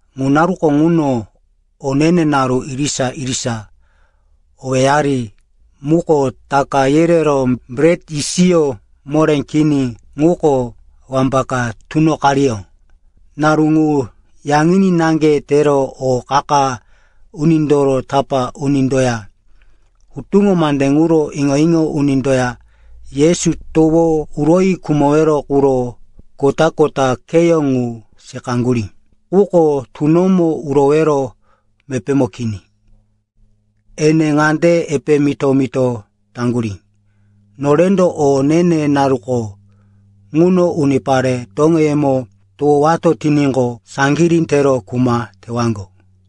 Ŋu naruko ŋuno o ne-ne naru irisa-irisa, owéyari muko Taka yereró, Bret Yisiyó Moré Kini, ŋuko wambaka tunoqariyó. Naru ŋu yaŋini naŋge tero o qa-qa unindoro tapá unindoya hutuŋo mande ŋuro iŋo-iŋo unindoya Yesu towo uroyi khumowero quro kota-kota kheyó ŋu seqaŋgurí. Quko tunomo urowero mepémo kini. Ene ŋande epe mito-mito taŋgurí, “Norendo o ne-ne naruko ŋuno unipare toŋeyemo towowato tiníqo, saŋgirí tero kuma tewaŋgo.”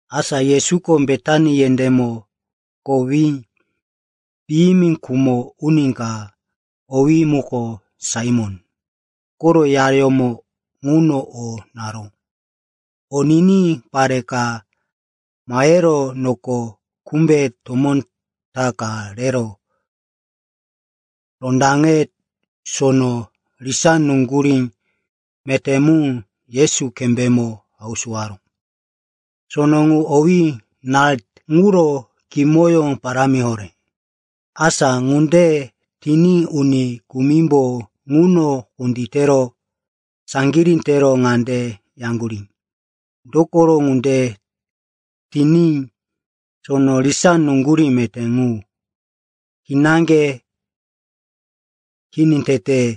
Asa Yesuko Betani yendémo kowí piyimi khumo uni ka, owí muko Saimon koro yayómo ŋuno o naró. O niní pare ka mahero noko kumbe tomó ta ka rero rondaŋe sono risá nuŋgurí meté mu Yesu kembémo hausuwaró. Sono ŋu owí “nart,” ŋuro kimoyó parámi horé. Asa ŋunde tiní uni kumimbo ŋuno kunditero saŋgirí tero ŋande yaŋgurí, “Dokoro ŋunde tiní sono risá nuŋgurí meté ŋu kinaŋge kini tete?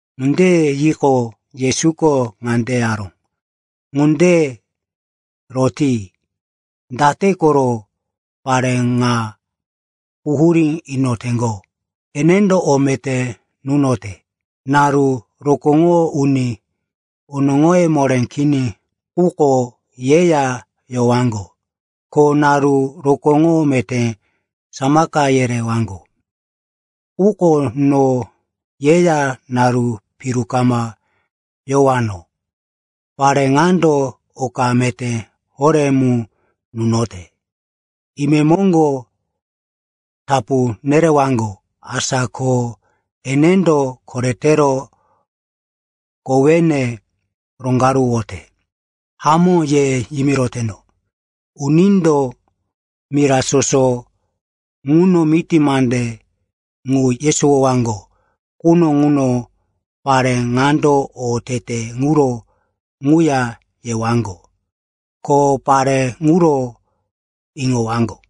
Ŋunde yiqo, Yesuko ŋande yaró, “Ŋunde roti. Date koro pare ŋa quhurí inoteŋgo? Enendo o meté nunote. Naru rokóŋoro uni onoŋoye moré kini ŋuko yeya yowaŋgo. Ko naru rokóŋo meté samaka yerewaŋgo. Quko no yeya naru piru kama yowano. Pare ŋando oka meté horé mu nunote. Imemoŋgo tapu nerewaŋgo. Asa ko enendo koretero kowene roŋgaruwote. Hamó ye yimiroteno, unindo mira soso ŋuno miti mande ŋu yesowoyowaŋgo quno ŋuno pare ŋando o tete ŋuro ŋuya yewaŋgo, ko pare ŋuro iŋowaŋgo.”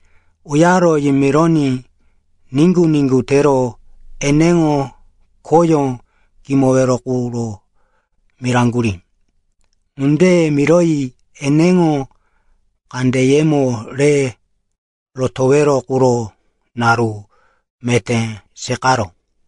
Uyaro yimironí niŋgu-niŋgu tero eneŋo khoyó kimowero quro miraŋgurí. Ŋunde miroyi eneŋo kandeyemo re rotowero quro naru meté seqaró.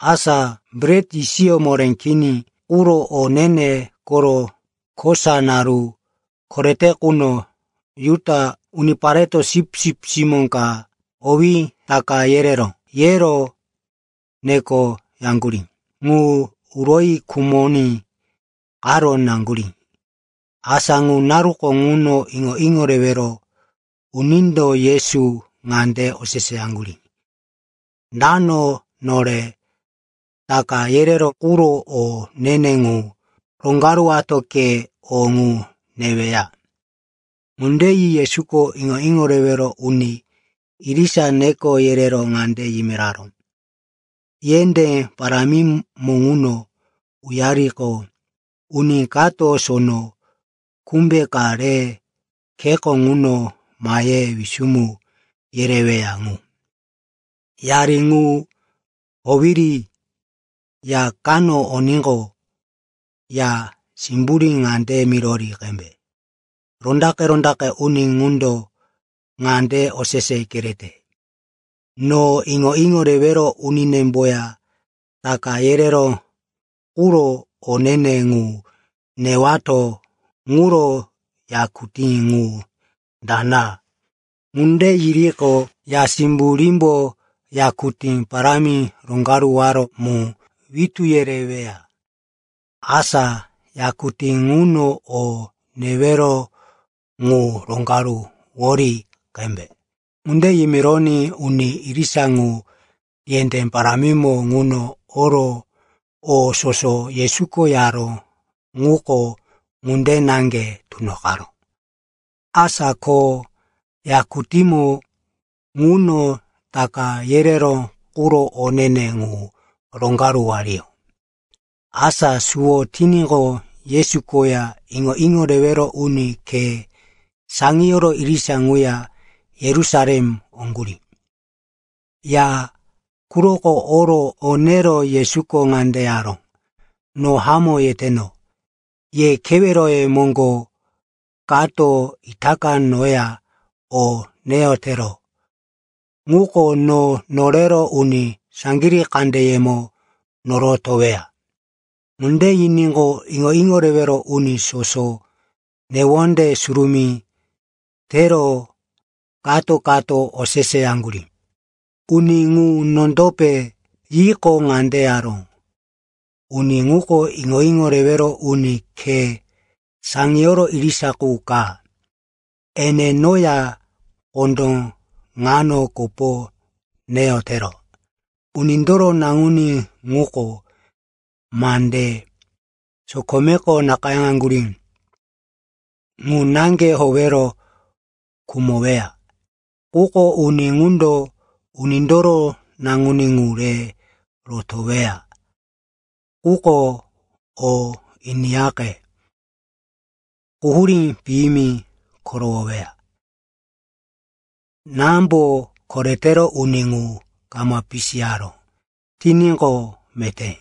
Asa Bret Yisiyó Moré Kini quro o ne-ne koro kosa naru korete quno Juda unipareto sipsip simó ka, owí, “Taka yereró,” yero nekoyaŋgurí ŋu uroyi khumoní qaro naŋgurí. Asa ŋu naruko ŋuno iŋo-iŋo rewero unindo Yesu ŋande oseseyaŋgurí, “Dano nore Taka yereró quro o ne-ne ŋu roŋgaruwato ke o ŋu neweya?” Ŋunde yi Yesuko iŋo-iŋo rewero uni irisa neko yerero ŋande yimiraró, “Yendé parámimo ŋuno uyaririqo, uni kato sono kumbe ka re kheko ŋuno mahe wisumu yereweya ŋu. Yari ŋu howiri ya kano oníqo, ya simburí ŋande mirori qembe, ‘Rondaqe-rondaqe uni ŋundo ŋande osese kerete: No iŋo-iŋo rewero uninemboya Taka yereró quro o ne-ne ŋu newato. Ŋuro yakutí ŋu dana?’ Ŋunde yiriqo, ya simburímbo yakutí parámi roŋgaruwaró mu witú yereweya. Asa yakutí ŋuno o newero ŋu roŋgaruwori qembe.” Ŋunde yimironí uni irisa ŋu yendé parámimo ŋuno oro o soso Yesuko yaró ŋuko ŋunde naŋge tunoqaró. Asa ko yakutímo ŋuno Taka yereró quro o ne-ne ŋu roŋgaruwariyó. Asa suwo tiníqo, Yesu koya iŋo-iŋo rewero uni khe saŋiyoro irisa ŋuya Yerusalem oŋgurí. Ya quroko oro o nero Yesuko ŋande yaró, “No hamó yeteno. Ye keweroyemo kato itaka noya o neyotero ŋuko no norero uni saŋgirí kandeyemo norotoweya.” Ŋunde yiníqo, iŋo-iŋo rewero uni soso newonde surumí tero kato-kato oseseyaŋgurí, “Uni ŋu nondope?” Yiqo, ŋande yaró, “Uni ŋuko iŋo-iŋo rewero uni khe saŋiyoro irisa qu ka. Ene noya kondó ŋano kopo neyotero. Unindoro Naŋuní ŋuko mande sokomeko nakayáŋgurí ŋu naŋge howero khumoweya. Quko uni ŋundo Unindoro Naŋuní ŋu re rotoweya quko, o iniyaqe, quhurí piyimi korowoweya. Námbo koretero uni ŋu kama pisiyaró tiníqo, meté.”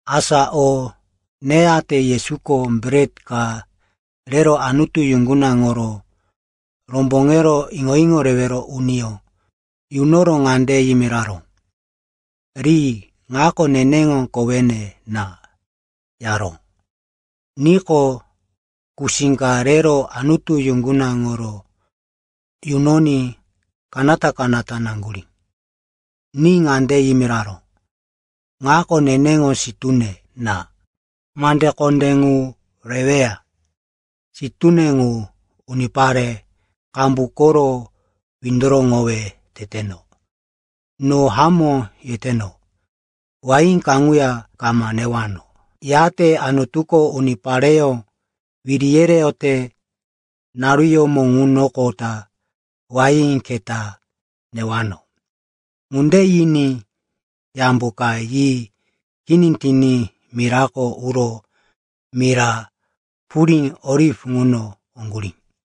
Asa o neyate Yesuko bret ka rero Anutu yuŋgunaŋoro romboŋero iŋo-iŋo rewero uniyó yunoro ŋande yimiraró, “Ri. Ŋako neneŋo kowene na,” yaró. Niqo, kusí ka rero Anutu yuŋgunaŋoro yunoní kanata-kanata naŋgurí. Ni ŋande yimiraró, “Ŋako neneŋo sitúne na, mande kondé ŋu reweya. Sitúne ŋu unipare qambu koro windoroŋowe teteno. No hamó yeteno. Wain kaŋuya kama newano, yate Anutuko unipareyó wiri yereyote naruyómo ŋunoqota, wain keta newano.” Ŋunde yiní yambo ka yi kini tiní mirako uro mira purí Oliv ŋuno oŋgurí.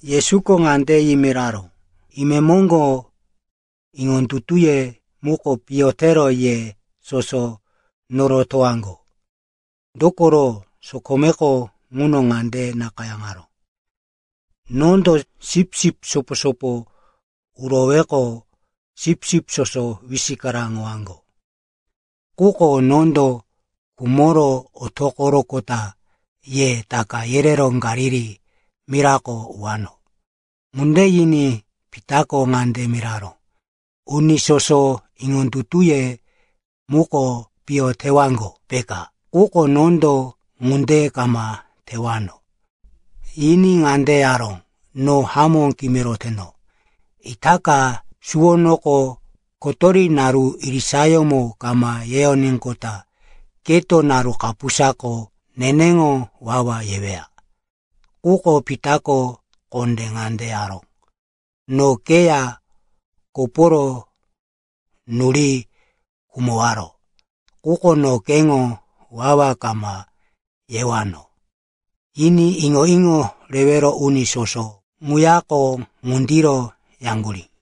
Yesuko ŋande yimiraró, “Imemoŋgo, iŋondutuye muko piyo tero ye soso norotowaŋgo. Dokoro sokomeko ŋuno ŋande nakayáŋaró, “‘Nondo sipsip sopo-sopo uroweqo sipsip soso wisikaraŋowaŋgo.’ Quko nondo khumoro otoqoroqota ye taka yerero Galili mirako uwano.” Ŋunde yiní Pitako ŋande miraró, “Uni soso iŋondutuye muko piyo tewaŋgo, peka, quko nondo ŋunde kama tewano.” Yiní ŋande yaró, “No hamó kimiroteno, itaka suwonoko kotori naru irisayómo kama yeyoníqota keto naru kapusako neneŋo wawa yeweya.” Quko Pitako kondé ŋande yaró, “No keya koporo nuri khumowaro, quko no keŋo wawa kama yewano,” yiní iŋo-iŋo rewero uni soso ŋuyako ŋundiro yaŋgurí.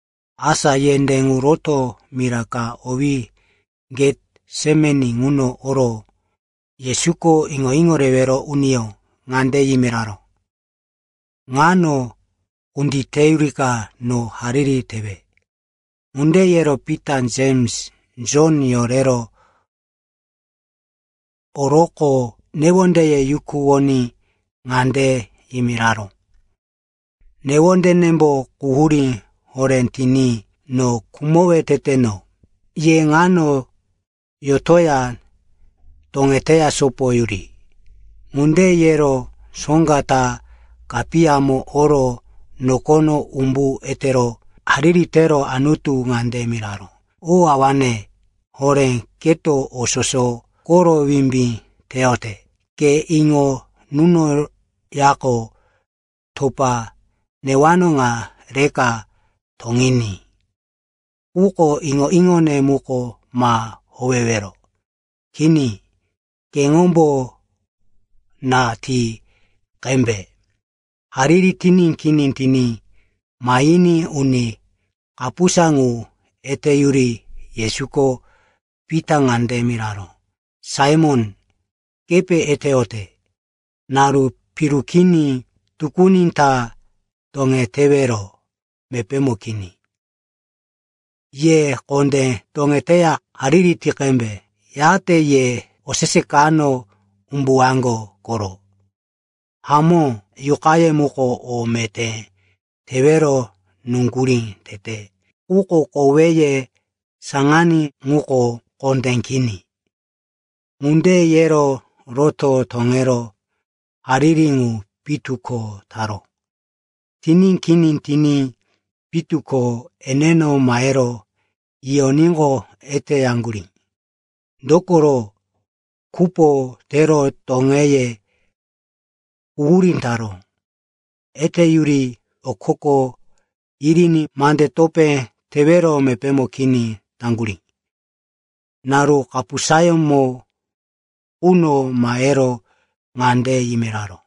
Asa yendé ŋu rotoro mira ka owé Getsemani ŋuno oro Yesuko iŋo-iŋo rewero uniyó ŋande yimiraró, “Ŋano kunditeyurika no hariri tewe.” Ŋunde yero Pita, Jems, Jon yorero oroqo newondeye yukuwoní ŋande yimiraró, “Newondenembo quhurí horé tiní no khumowe teteno. Ye ŋano yotoya toŋete sopoyuri.” Ŋunde yero soŋga ta kapiyamo oro nokono umbu etero hariri tero Anutu ŋande miraró, “O awane horé, keto o soso koro wimbí teyote. Ke iŋo nunoyaqo, topa newano ŋa rika toŋiní. Quko iŋo-iŋone mu ma howewero. Kini, keŋombo na ti qembe.” Hariri tiní kini tiní mahiní uni kapusa ŋu eteyuri Yesuko Pita ŋande miraró, “Saimon, kepe eteyote? Naru piru kini, tukuni ta toŋetewero mepémo kini. Ye kondé toŋeteya hariri ti qembe. Yate ye osese kano umbuwaŋgo koro. Hamó, yuqaye muko o meté tewero nuŋgurí tete, quko koweye saŋaní ŋuko kondé kini.” Ŋunde yero roto toŋero hariri ŋu pitu ko taró. Tiní kini tiní pitu ko eneno mahero yiyoníqo, eteyaŋgurí, dokoro kupo tero toŋeye quhurí taró. Eteyuri okoko yiriní mande topé tewero mepémo kini taŋgurí. Naru kapusayómo quno mahero ŋande yimiraró,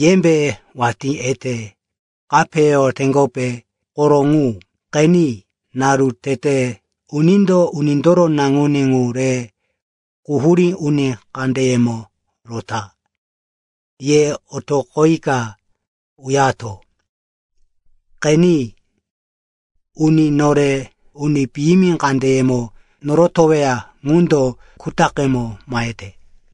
“Yembe watí ete kapeyoteŋgope? Koro ŋu! Qeni, naru tete, unindo Unindoro Naŋuní ŋu re quhurí uni kandeyemo rota. Ye otoqoyika uyato. Qeni, uni nore uni piyimi kandeyemo norotoweya ŋundo kutaqemo mahete.”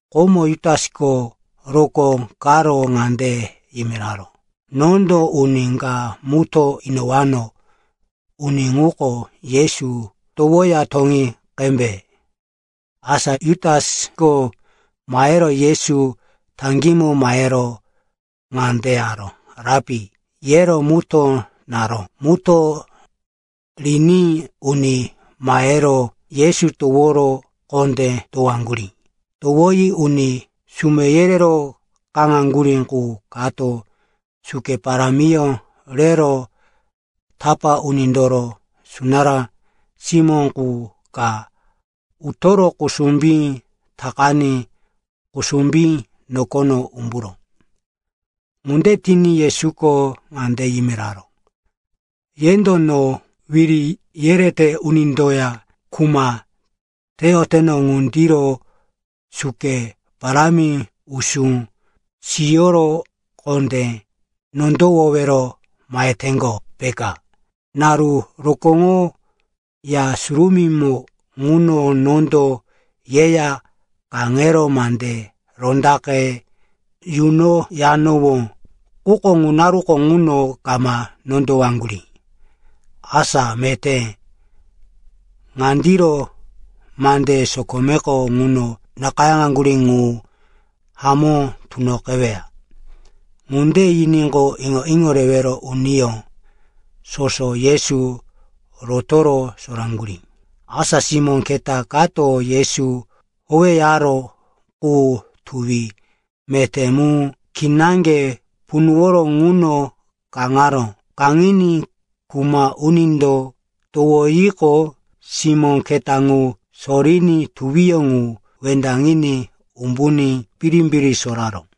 Komo Jutasko rokó karo ŋande yimiraró, “Nondo uni ka mutó inowano. Uni ŋuko Yesu, towoya toŋi qembe.” Asa Jutasko mahero Yesu taŋgímo mahero ŋande yaró, “Rapi,” yero mutó naró. Mutó riní uni mahero Yesu toworo kondé towaŋgurí. Towoyi uni sume yerero kaŋaŋgurí qu kato suke parámiyó rero tapá unindoro sunará simó qu ka utoro kusumbí takaní kusumbí nokono umburó. Ŋunde tiní Yesuko ŋande yimiraró, “Yendo no wiri yerete unindoya kuma teyoteno ŋundiro suke parámi, usú siyoro kondé nondowowero maheteŋgo, peka? Naru rokóŋo Ya Surumímo ŋuno nondo yeya kaŋero mande rondaqe yunoyanowó. Quko ŋu naruko ŋuno kama nondowaŋgurí. Asa meté, ŋandiro mande sokomeko ŋuno nakayáŋaŋgurí ŋu hamó tunoqeweya.” Ŋunde yiníqo, iŋo-iŋo rewero uniyó soso Yesu rotoro soraŋgurí. Asa simó keta kato Yesu howeyaró qu tuwi meté mu kinaŋge punuworo ŋuno kaŋaró. Kaŋiní kuma unindo towoyiqo, simó keta ŋu soriní tuwi ŋu wendaŋiní umbuní birimbiri soraró.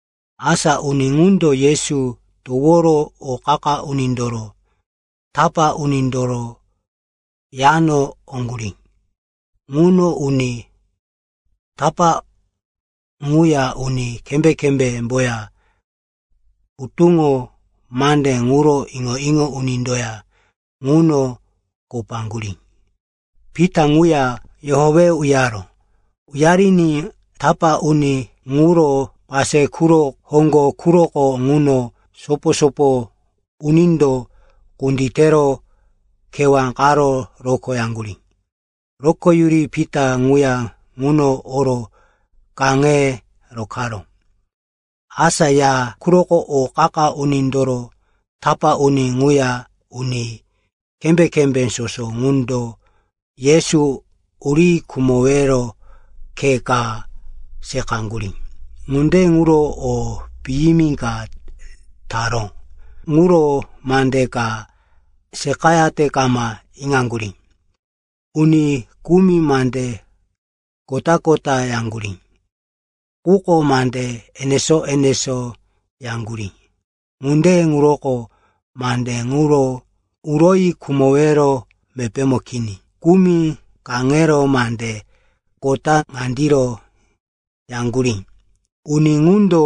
Asa uni ŋundo Yesu toworo o qa-qa unindoro tapá unindoro yano oŋgurí. Ŋuno uni tapá ŋuya uni kembé-kembémboya hutuŋo mande ŋuro iŋo-iŋo unindoya ŋuno kopaŋgurí. Pita ŋuya yohowe uyaró. Uyariní tapá uni ŋuro pase quro hoŋgo quroko ŋuno sopo-sopo unindo kunditero kewá qaro rokoyaŋgurí. Rokoyuri Pita ŋuya ŋuno oro kaŋe rokaró. Asa ya quroko O qa-qa unindoro tapá uni ŋuya uni kembé-kembé soso ŋundo Yesu uri khumowero khe ka seqaŋgurí. Ŋunde ŋuro o piyimi ka taró ŋuro mande ka seqayate kama iŋaŋgurí. Uni kumi mande kota-kota yaŋgurí, quko mande enesó-enesó yaŋgurí. Ŋunde ŋuroko mande ŋuro uroyi khumowero mepémo kini. Kumi kaŋero mande kota ŋandiro yaŋgurí, “Uni ŋundo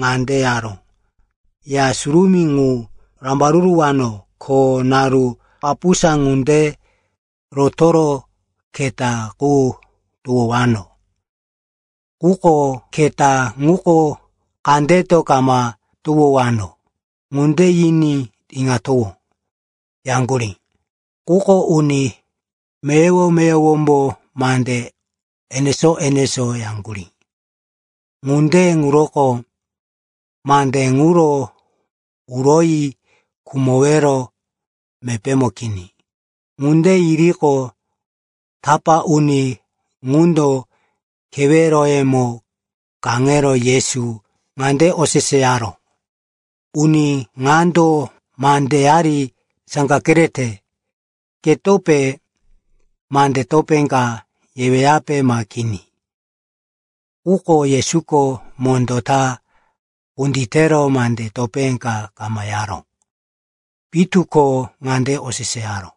ŋande yaró, ‘Ya Surumí ŋu rambaruruwano. Ko naru kapusa ŋunde rotoro keta qu towowano. Quko keta ŋuko kandeto kama towowano.’ Ŋunde yiní iŋatowó,” yaŋgurí. Quko uni meyowo-meyowombo mande enesó-enesó yaŋgurí. Ŋunde ŋuroko mande ŋuro uroyi khumowero mepémo kini. Ŋunde yiriqo, tapá uni ŋundo keweroyemo kaŋero Yesu ŋande oseseyaró, “Uni ŋando mandeyari saŋga kerete. Ketope mande topé ka yeweyape ma kini?” Quko Yesuko mondó ta kunditero mande topé ka kama yaró. Pitu ko ŋande oseseyaró,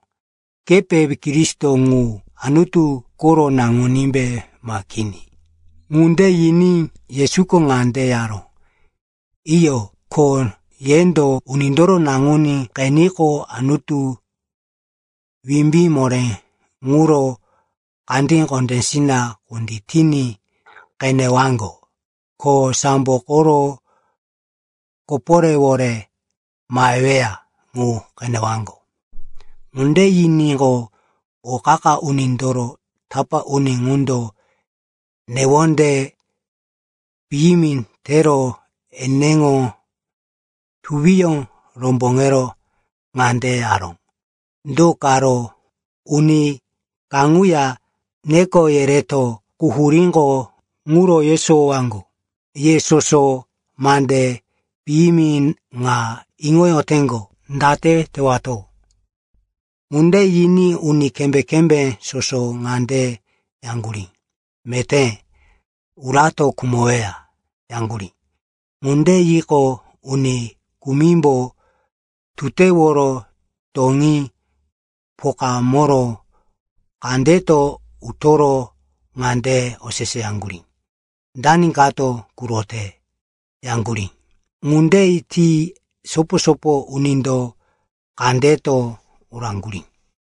“Kepe Kristo ŋu, Anutu koro Naŋunímbe, ma kini?” Ŋunde yiní Yesuko ŋande yaró, “Iyo. Ko yendo Unindoro Naŋuní qeniqo, Anutu wimbí moré ŋuro kandí kondésina kunditiní qenewaŋgo, ko sambo koro koporéwore maheweya ŋu qenewaŋgo.” Ŋunde yiníqo, o qa-qa unindoro tapá uni ŋundo newonde piyimi tero eneŋo tuwiyó romboŋero ŋande yaró, “Do karo uni kaŋuya neko yereto quhuríŋo ŋuro yesowowaŋgo! Ye soso mande piyimi ŋa iŋoyoteŋgo. Date tewato?” Ŋunde yiní uni kembé-kembé soso ŋande yaŋgurí, “Meté urato khumoweya,” yaŋgurí. Ŋunde yiqo, uni kumimbo tuteworo toŋí pokamoro kandeto utoro ŋande oseseyaŋgurí, “Dani kato kurote?” yaŋgurí. Ŋunde ti sopo-sopo unindo kandeto uraŋgurí.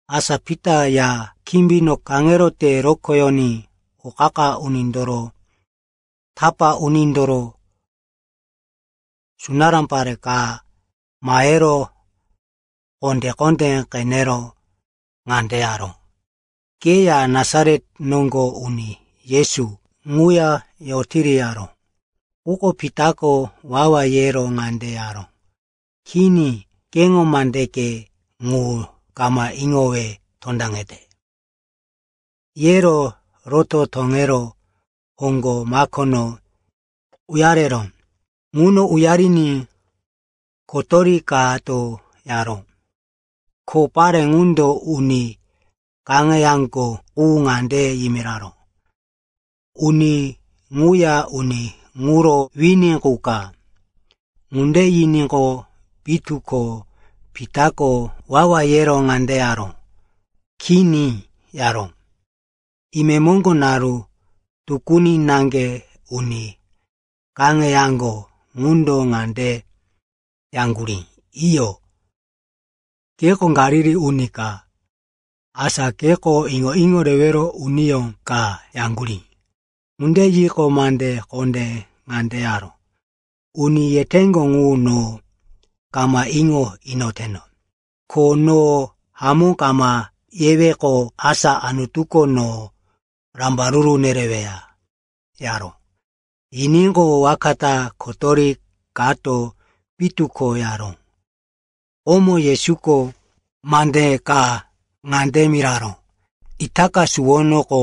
Asa Pita ya kimbino kaŋero te rokoyoní o qa-qa unindoro tapá unindoro sunará pare ka mahero kondé-kondé qenero ŋande yaró, “Keya Nasaret noŋgo uni Yesu ŋuya yotiri,” yaró. Quko Pitako wawa yero ŋande yaró, “Kini, keŋo mandeke ŋu kama iŋowe tondaŋete,” yero roto toŋero hoŋgo makono uyareró. Ŋuno uyariní kotori kato yaró. Ko pare ŋundo uni kaŋeyaŋgo qu ŋande yimiraró, “Uni ŋuya uni ŋuro wini qu ka.” Ŋunde yiníqo, pitu ko Pitako wawa yero ŋande yaró, “Kini,” yaró. Imemoŋgo, naru tukuni naŋge, uni kaŋeyaŋgo ŋundo ŋande yaŋgurí, “Iyo, keko Galili uni ka. Asa keko iŋo-iŋo rewero uniyó ka,” yaŋgurí. Ŋunde yiqo, mande kondé ŋande yaró, “Uni yeteŋgo ŋu no kama iŋo inoteno! Ko no hamó kama yeweqo, asa Anutuko no rambaruru nereweya,” yaró. Yiníqo, waka ta kotori kato pitu ko yaró. Komo Yesuko mande ka ŋande miraró, “Itaka suwonoko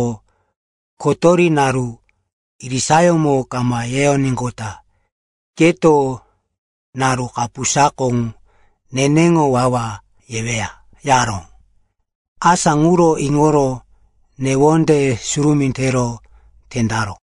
kotori naru irisayómo kama yeyoníqota keto naru kapusako neneŋo wawa yeweya,” yaró. Asa ŋuro iŋoro newonde surumí tero tendaró.